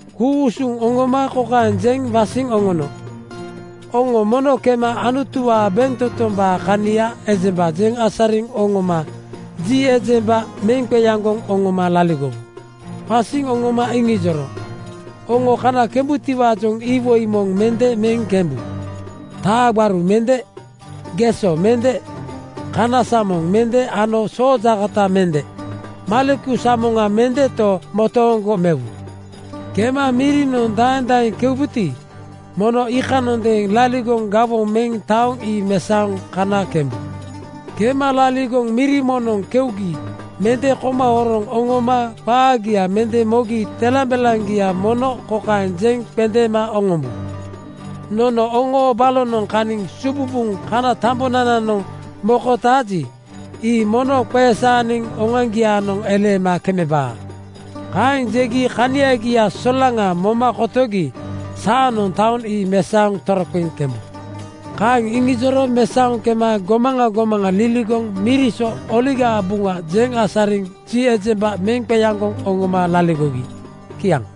Ku-usuŋ oŋoma kokaeŋ jeŋ wasiŋ oŋono, “Oŋo mono kema Anutuwaa bentotombaa kania ejemba jeŋ asariŋ oŋoma ji ejemba meŋ qeaŋgoŋ oŋoma laligowu.” Wasiŋ oŋoma iŋijoro, “Oŋo kana kembutiwaajoŋ iwoi moŋ mende meŋ kembu, taa gbaru mende, geso mende, kana samoŋ mende ano soojaakota mende. Maleku samoŋa mendeto, motooŋgo mewu. “Kema mirinoŋ daeŋ daeŋ keubuti, mono iikanondeeŋ laligoŋ gawoŋ meŋ taoŋ ii mesaoŋ kana kembu. Kema laligoŋ miri moŋnoŋ keugi mende koma horoŋ oŋoma qaagia mende mogi telambelaŋgia mono kokaeŋ jeŋ qendeema oŋombu, ‘Nono oŋoo balonoŋ kaniŋ sububuŋ kana tambonananoŋ mokotaaji, ii mono qesaaniŋ oŋoaŋgiaanoŋ eleema kemebaa.’ Kaeŋ jegi kaniagia solaŋa moma kotogi saanoŋ taoŋ ii mesaoŋ toroqeŋ kembu.” Kaeŋ iŋijoro mesaoŋ kema gomaŋa gomaŋa liligoŋ miri so Oligaa Buŋa jeŋ asariŋ ji ejemba meŋ qeaŋgoŋ oŋoma laligogi. Kiaŋ.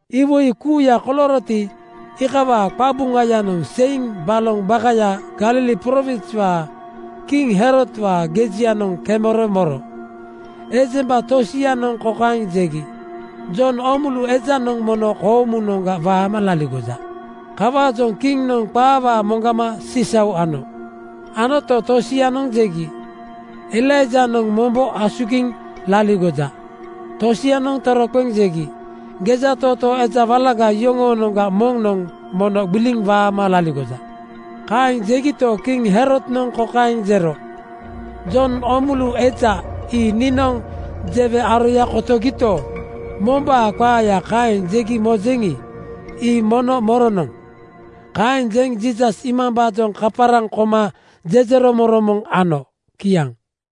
Iwoi kuuya kolooroti, iikawaa qabuŋayanoŋ seiŋ baloŋ bakayaa (Galili prowinswaa) kiŋ Herodwaa gejianoŋ kemero moro. Ejemba tosianoŋ kokaeŋ jegi, “Jon Oomulu ejanoŋ mono koomunoŋga waama laligoja.” Kawaajoŋ kiŋnoŋ qaawaa moŋgama sisau ano. Anoto, tosianoŋ jegi, “Elaijanoŋ mombo asugiŋ laligoja.” Tosianoŋ toroqeŋ jegi, “Gejatootoo eja walaga yoŋoonoŋga moŋnoŋ mono gbiliŋ waama laligoja.” Kaeŋ jegito, kiŋ Herodnoŋ kokaeŋ jero, “Jon Oomulu eja ii niinoŋ jewe aroya kotogito, mombaa qaaya kaeŋ jegi mojeŋi, ii mono moronoŋ?” Kaeŋ jeŋ Jiisas iimambaajoŋ kaparaŋ koma jejeromoŋromoŋ ano. Kiaŋ.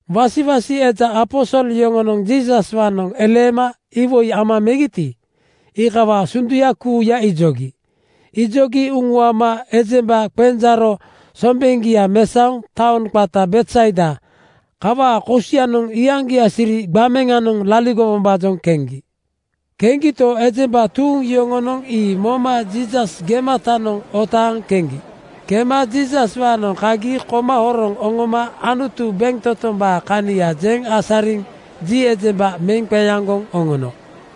Wasiwasi eja aposol yoŋonoŋ Jiisaswaanoŋ eleema iwoi ama megiti, iikawaa sunduya kuuya ijogi. Ijogi uŋuama ejemba qenjaaro sombeŋgia mesaoŋ taoŋ qata Betsaida kawaa kosianoŋ iyaŋgia siri gbameŋanoŋ laligowombaajoŋ keŋgi. Keŋgito, ejemba tuuŋ yoŋonoŋ ii moma Jiisas gematanoŋ otaaŋ keŋgi. Kema Jiisas-waanoŋ kagi koma horoŋ oŋoma Anutu bentotombaa kania jeŋ asariŋ ji ejemba meŋ qeaŋgoŋ oŋono.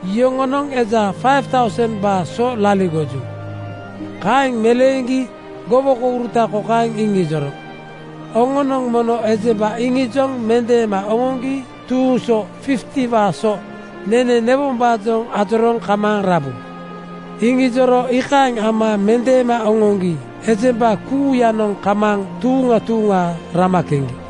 (Yoŋonoŋ eja 5,000:baa so laligoju.)” Kaeŋ meleeŋgi gowokouruta kokaeŋ iŋijoro, “Oŋonoŋ mono ejemba iŋijoŋ mendeema oŋoŋgi tuuŋ so 50:waa so nene newombaajoŋ ajorooŋ kamaaŋ rabu.” Iŋijoro iikaeŋ ama mendeema oŋoŋgi ejemba kuuyanoŋ kamaaŋ tuuŋa tuuŋa rama keŋgi.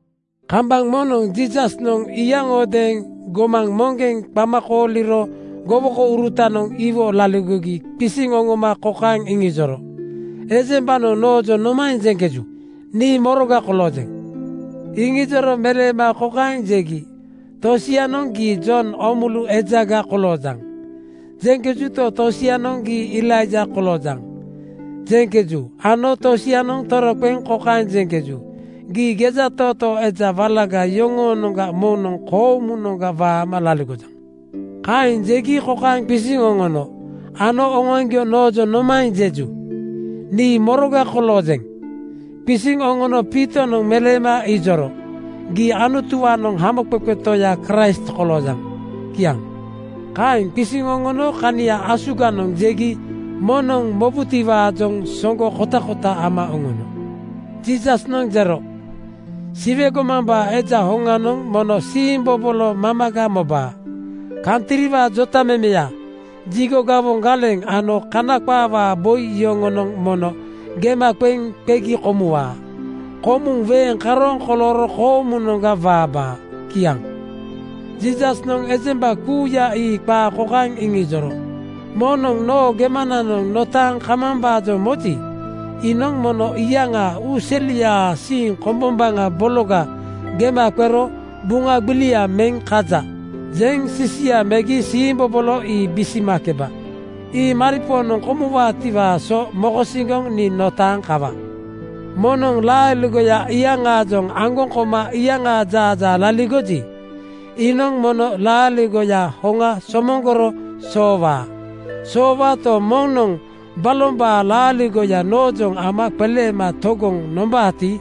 Kambaŋ moŋnoŋ Jiisasnoŋ iyaŋodeeŋ gomaŋ moŋgeŋ qama kooliro gowokourutanoŋ iwo laligogi qisiŋ oŋoma kokaeŋ iŋijoro, “Ejembanoŋ noojoŋ nomaeŋ jeŋkeju? Nii moroga koloojeŋ?” Iŋijoro meleema kokaeŋ jegi, “Tosianoŋ ‘Gii Jon Oomulu ejaga koloojaŋ,’ jeŋkejuto, tosianoŋ ‘Gii Elaija koloojaŋ,’ jeŋkeju ano tosianoŋ toroqeŋ kokaeŋ jeŋkeju, ‘Gii gejatootoo eja walaga yoŋoonoŋga moŋnoŋ koomunoŋga waama laligojaŋ.’” Kaeŋ jegi kokaeŋ qisiŋ oŋono, “Ano oŋoaŋgio noojoŋ nomaeŋ jeju? Nii moroga koloojeŋ?” Qisiŋ oŋono Piitonoŋ meleema ijoro, “Gii Anutuwaanoŋ Hamoqeqe Toya Kraist koloojaŋ.” Kiaŋ. Kaeŋ qisiŋ oŋono kania asuganoŋ jegi moŋnoŋ mobutiwaajoŋ soŋgo kotakota ama oŋono. Jiisasnoŋ jero, “Siwe gomambaa Eja hoŋanoŋ mono siimbobolo mamaga mobaa. Kantriwaa jotamemeya, jigo gawoŋ galeŋ ano Kana qaawaa boi yoŋonoŋ mono gema qeŋ qegi komuwaa. Komuŋ weeŋ karooŋ kolooro koomunoŋga waabaa.” Kiaŋ. Jiisasnoŋ ejemba kuuya ii qaa kokaeŋ iŋijoro, “Moŋnoŋ noo gemananoŋ notaaŋ kamambaajoŋ moji, iinoŋ mono iyaŋaa uuseliaa siiŋ kombombaŋa bologa gema qero ‘Buŋa gbilia meŋ kaja,’ jeŋ sisia megi siimbobolo ii bisimakeba. Ii maripoonoŋ komuwaatiwaa so mokosiŋgoŋ nii notaaŋ kawa. “Moŋnoŋ laaligoya iyaŋaajoŋ aŋgoŋ koma iyaŋaa jaajaa laligoji, iinoŋ mono laaligoya hoŋa somoŋgoro soowaa. Soowaato, moŋnoŋ balombaa laaligoya noojoŋ ama qeleema togoŋ nombaati,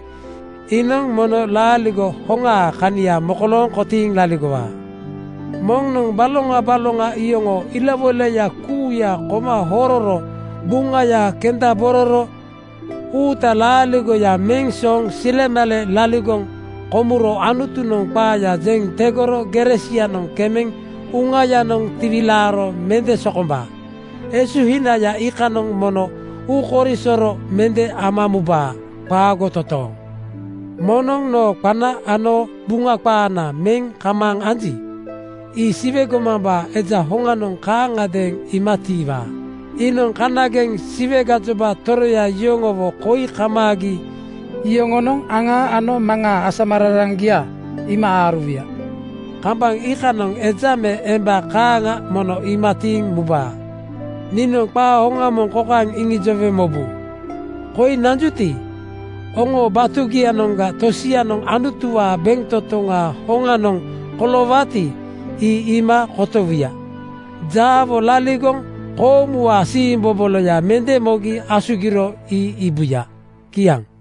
iinoŋ mono laaligo hoŋaa kania mokolooŋ kotiiŋ laligowaa. “Moŋnoŋ baloŋa baloŋa iyoŋoo ilawoilaya kuuya koma hororo buŋaya kendabororo uutaa laaligoya meŋ sooŋ silemale laligoŋ komuro Anutunoŋ qaaya jeŋ tegoro gere sianoŋ kemeŋ uŋayanoŋ tiwilaaro mende sokombaa. Esuhinaya iikanoŋ mono uukoisoro mende ama mubaa. Qaago totooŋ! “Moŋnoŋ noo qana ano Buŋa qaana meŋ kamaaŋ anji, ii Siwe gomambaa Eja hoŋanoŋ kaaŋagadeeŋ iima tiiwaa. Iinoŋ kanageŋ Siwe gajoba toroya yoŋowo koi kamaagi iyoŋoonoŋ, aŋaa ano Maŋaa asamararaŋgia iima aaruwuya. Kambaŋ iikanoŋ eja me emba kaaŋa mono iima tiiŋ mubaa. Niinoŋ qaa hoŋa moŋ kokaeŋ iŋijowe mobu: Koi nanjuti, oŋoo batugianoŋga tosianoŋ Anutuwaa bentotoŋaa hoŋanoŋ koloowaati, ii iima kotowuya. Jaawo laligoŋ koomuwaa siimboboloya mende mogi asugiro ii iibuya.” Kiaŋ.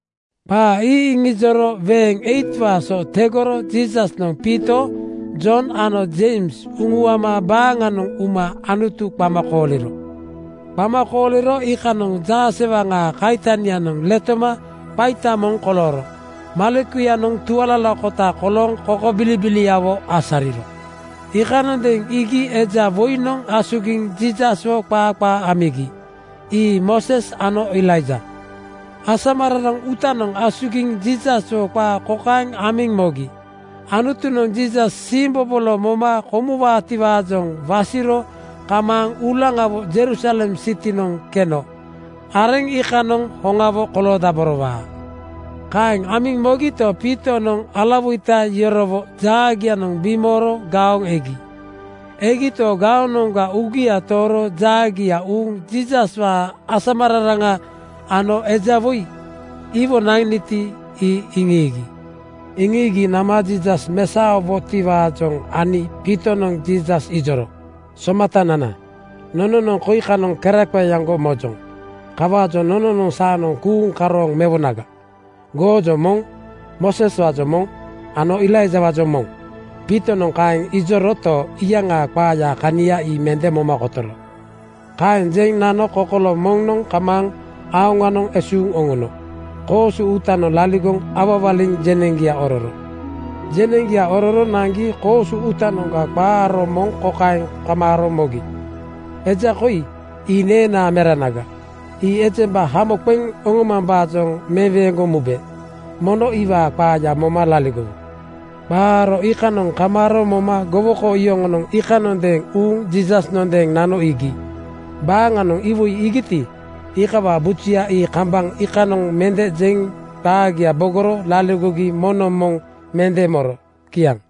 Qaa ii iŋijoro weeŋ 8:waa so tegoro Jiisasnoŋ Piito, Jon ano Jeims uŋuama baaŋanoŋ uma Anutu qama kooliro. Qama kooliro iikanoŋ jaasewaŋaa kaitanianoŋ letoma qaita moŋ kolooro. Malekuyanoŋ tualalakota kolooŋ kokobilibiliawo asariro. Iikanondeeŋ iigi eja woinoŋ asugiŋ Jiisaswo qaa qaa amigi. Ii Mooses ano Elaija. Asamararaŋ uutanoŋ asugiŋ Jiisaswo qaa kokaeŋ amiŋ mogi, “Anutunoŋ Jiisas siimbobolo moma komuwaati-waajoŋ wasiro kamaaŋ uulaŋawo Jerusalem sitinoŋ keno areŋ iikanoŋ hoŋawo koloodaborowaa.” Kaeŋ amiŋ mogito, Piitonoŋ alawoita yorowo jaagianoŋ bimooro gaoŋ egi. Egito, gaonoŋga uugia tooro jaagia uuŋ Jiisaswaa asamararaŋa ano eja woi iwo naniti, ii iŋiigi. Iŋiigi nama Jiisas mesaowotiwaajoŋ ani Piitonoŋ Jiisas ijoro, “Somatanana, nononoŋ koi kanoŋ keraqeeaŋgo mojoŋ. Kawaajoŋ nononoŋ saanoŋ kuuŋ karooŋ mewoŋa: Goojoŋ moŋ, Mooseswaajoŋ moŋ ano Elaijawaajoŋ moŋ.” Piitonoŋ kaeŋ ijoroto, iyaŋaa qaayaa kania ii mende moma kotoro. Kaeŋ jeŋ nano kokolo moŋnoŋ kamaaŋ aoŋanoŋ esuuŋ oŋono koosu uutanoŋ laligoŋ awawaliŋ jeneŋgia ororo. Jeneŋgia ororo naŋgi koosu uutanoŋga qa aro moŋ kokaeŋ kamaaro mogi, “Eja koi ii neenaa meranaga. Ii ejemba hamo qeŋ oŋomambaajoŋ meweeŋgoŋ mube. Mono iwaa qaaya moma laligowu.” Qa aro iikanoŋ kamaaro moma gowoko yoŋonoŋ iikanondeeŋ uuŋ Jiisasnondeeŋ nano iigi. Baaŋanoŋ iwoi iigiti, iikawaa bujuya ii kambaŋ iikanoŋ mende jeŋ qaagia bogoro laligogi moŋnoŋ moŋ mende moro. Kiaŋ.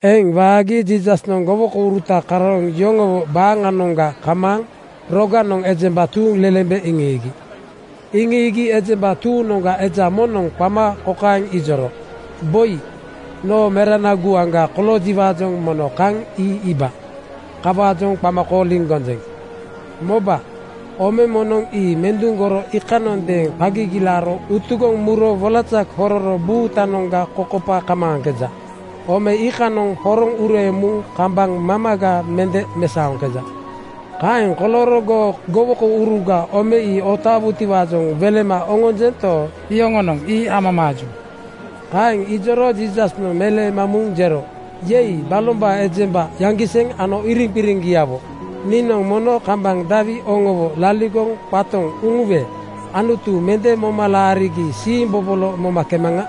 Eŋ waagi Jiisasnoŋ gowokouruta karooŋ yoŋowo baaŋanoŋga kamaaŋ roganoŋ ejemba tuuŋlelembe iŋiigi. Iŋiigi ejemba tuuŋnoŋga eja moŋnoŋ qama kokaeŋ ijoro, “Boi, noo merana guaŋga koloojiwaajoŋ mono kaŋ ii iiba. Kawaajoŋ qama kooliŋ gonjeŋ. Moba, ome moŋnoŋ ii menduŋgoro iikanondeeŋ qa gigilaaro utugoŋ muro wolaza hororo buutanoŋga kokopa kamaaŋkeja. Ome iikanoŋ horoŋ ureeŋ muŋ kambaŋ mamaga mende mesaoŋkeja. Kaeŋ kolooro goo gowokouruga ome ii otaawutiwaajoŋ welema oŋonjento, yoŋonoŋ ii amamaaju.” Kaeŋ ijoro Jiisasnoŋ meleema muŋ jero, “Yei, balombaa ejemba yaŋgiseŋ ano iriŋqiriŋgiawo, niinoŋ mono kambaŋ dawi oŋowo laligoŋ qatoŋ uŋuwe Anutu mende moma laarigi siimbobolo momakemaŋa?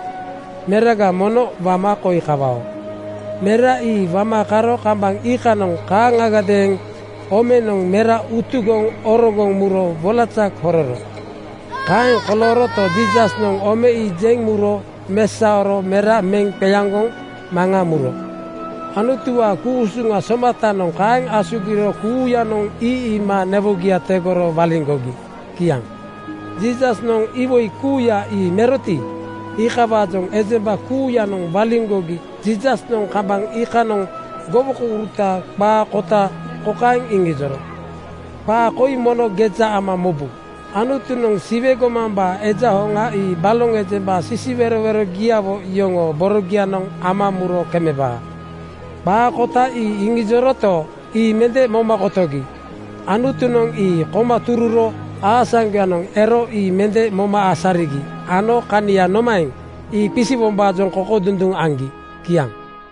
Meraga mono wama koi kawao.” Mera ii wama karo kambaŋ iikanoŋ kaaŋagadeeŋ omenoŋ mera utugoŋ orogoŋ muro wolaza hororo. Kaeŋ kolooroto, Jiisasnoŋ ome ii jeŋ muro mesaoro mera meŋ qeaŋgoŋ maŋa muro. Anutuwaa ku-usuŋa somatanoŋ kaeŋ asugiro kuuyanoŋ ii iima newogia tegoro waliŋgogi. Kiaŋ. Jiisasnoŋ iwoi kuuya ii meroti, iikawaajoŋ ejemba kuuyanoŋ waliŋgogi Jiisasnoŋ kambaŋ iikanoŋ gowokouruta qaa kota kokaeŋ iŋijoro, “Qaa koi mono geja ama mobu: Anutunoŋ Siwe gomambaa Eja hoŋa ii baloŋ ejemba sisiwerowerogiawo yoŋoo borogianoŋ ama muro kemebaa.” Qaa kota ii iŋijoroto, ii mende moma kotogi. Anutunoŋ ii koma tururo aasaŋgoyanoŋ ero ii mende moma asarigi ano kania nomaeŋ, ii qisiwombaajoŋ kokodunduŋ aŋgi. Kiaŋ.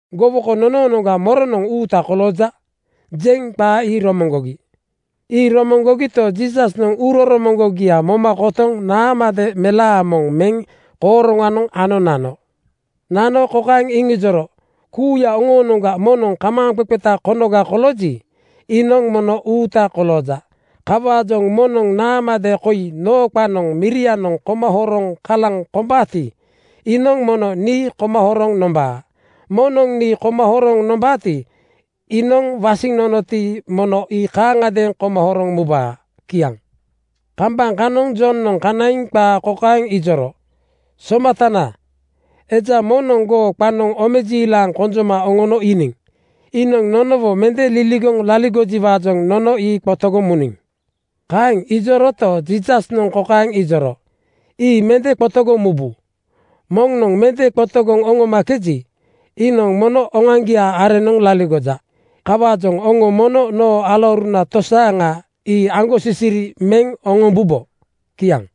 Gowoko nonoonoŋga ‘Moronoŋ uuta kolooja?’ jeŋ qaa ii romoŋgogi. Ii romoŋgogito, Jiisasnoŋ uuroromoŋgogia moma kotoŋ naamade melaa moŋ meŋ kooroŋanoŋ ano nano. Nano kokaeŋ iŋijoro, “Kuuya oŋoonoŋga moŋnoŋ kamaaŋqeqeta konoga kolooji, iinoŋ mono uuta kolooja. Kawaajoŋ moŋnoŋ naamade koi noo qananoŋ mirianoŋ koma horoŋ kalaŋ kombaati, iinoŋ mono nii koma horoŋ nombaa. Moŋnoŋ nii koma horoŋ nombaati, iinoŋ wasiŋ nonoti, mono ii kaaŋagadeeŋ koma horoŋ mubaa.” Kiaŋ. Kambaŋ kanoŋ Jonoŋ kanaiŋ qaa kokaeŋ ijoro, “Somatana, eja moŋnoŋ goo qanoŋ omejiilaŋ konjoma oŋono iiniŋ. Iinoŋ nonowo mende liligoŋ laligojiwaajoŋ nono ii qotogoŋ muniŋ.” Kaeŋ ijoroto, Jiisasnoŋ kokaeŋ ijoro, “Ii mende qotogoŋ mubu. Moŋnoŋ mende qotogoŋ oŋomakeji, iinoŋ mono oŋoaŋgiaa areŋnoŋ laligoja. (Kawaajoŋ oŋo mono noo alauruna tosaaŋa ii aŋgosisiri meŋ oŋombubo.)” Kiaŋ.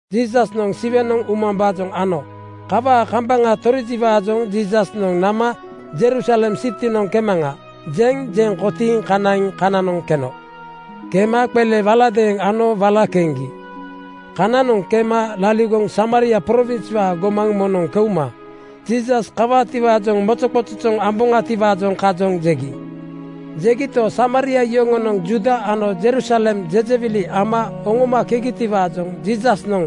Jiisasnoŋ Siwenoŋ umambaajoŋ ano. Kawaa kambaŋa torijiwaajoŋ Jiisasnoŋ nama “Jerusalem sitinoŋ kemaŋa,” jeŋ jeŋ kotiiŋ kanaiŋ kananoŋ keno. Kema qele waladeeŋ ano wala keŋgi. Kananoŋ kema laligoŋ Samaria prowinswaa gomaŋ moŋnoŋ keuma “Jiisas kawaatiwaajoŋ mozoqozojoŋ amboŋatiwaajoŋ kajoŋ,” jegi. Jegito, Samaria yoŋonoŋ Juuda ano Jerusalem jejewili ama oŋomakegitiwaajoŋ Jiisasnoŋ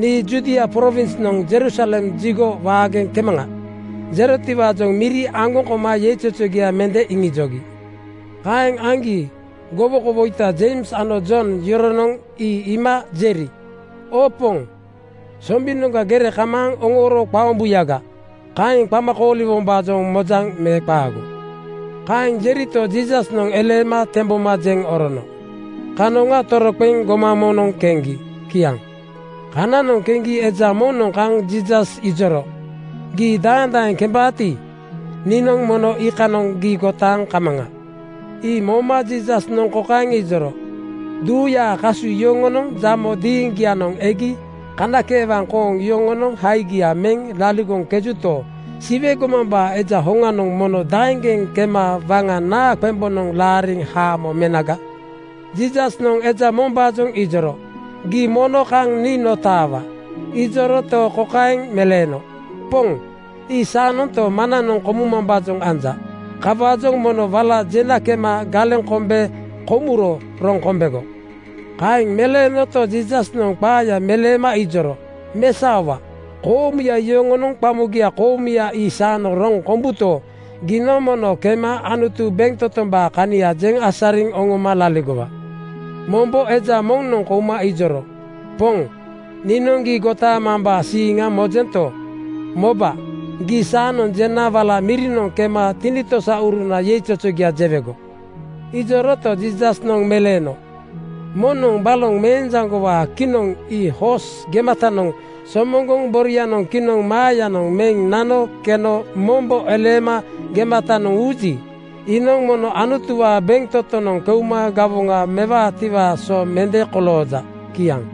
“Nii Judia prowinsnoŋ Jerusalem jigo waageŋ kemaŋa,” jerotiwaajoŋ miri aŋgoŋ koma yeizozogia mende iŋijogi. Kaeŋ aŋgi gowokowoita Jeims ano Jon yoronoŋ ii iima jeri, “Oo Poŋ, sombinoŋga gere kamaaŋ oŋooro qaombuyaga, kaeŋ qama kooliwombaajoŋ mojaŋ me qaago?” Kaeŋ jerito, Jiisasnoŋ eleema temboma jeŋ orono. Kanoŋa toroqeŋ gomaŋ moŋnoŋ keŋgi. Kiaŋ. Kananoŋ keŋgi eja moŋnoŋ kaŋ Jiisas ijoro, “Gii daeŋ daeŋ kembaati, niinoŋ mono iikanoŋ gii gotaaŋ kamaŋa.” Ii moma Jiisasnoŋ kokaeŋ ijoro, “Duuyaa kasu yoŋonoŋ jamo diiŋgianoŋ egi kanakeewaŋ kooŋ yoŋonoŋ haigia meŋ laligoŋkejuto, Siwe gomambaa Eja hoŋanoŋ mono daeŋgeŋ kema waŋa naa qembonoŋ laariŋ haamo menaga?” Jiisasnoŋ eja mombaajoŋ ijoro, “Gii mono kaŋ nii notaawa.” Ijoroto, kokaeŋ meleeno, “Poŋ, ii saanonto, maŋnanoŋ komumambaajoŋ anja. Kawaajoŋ mono wala jena kema galeŋ kombe komuro roŋ kombego.” Kaeŋ meleenoto, Jiisasnoŋ qaaya meleema ijoro, “Mesaowa! Koomuya yoŋonoŋ qamogia koomuya ii saanoŋ roŋ kombuto, giinoŋ mono kema Anutu bentotombaa kania jeŋ asariŋ oŋoma laligowa.” Mombo eja moŋnoŋ kouma ijoro, “Poŋ, niinoŋ gii gotaamambaa siiŋa mojento, moba, gii saanoŋ jena wala mirinoŋ kema tinitosauruna yeizozogia jewego.” Ijoroto, Jiisasnoŋ meleeno, “Moŋnoŋ baloŋ meenjaŋgowaa kinoŋ ii hoos gematanoŋ somoŋgoŋ borianoŋ kinoŋ maayanoŋ meŋ nano keno mombo eleema gematanoŋ uuji, iinoŋ mono Anutuwaa bentotonoŋ keuma gawoŋa mewaatiwaa so mende kolooja.” Kiaŋ.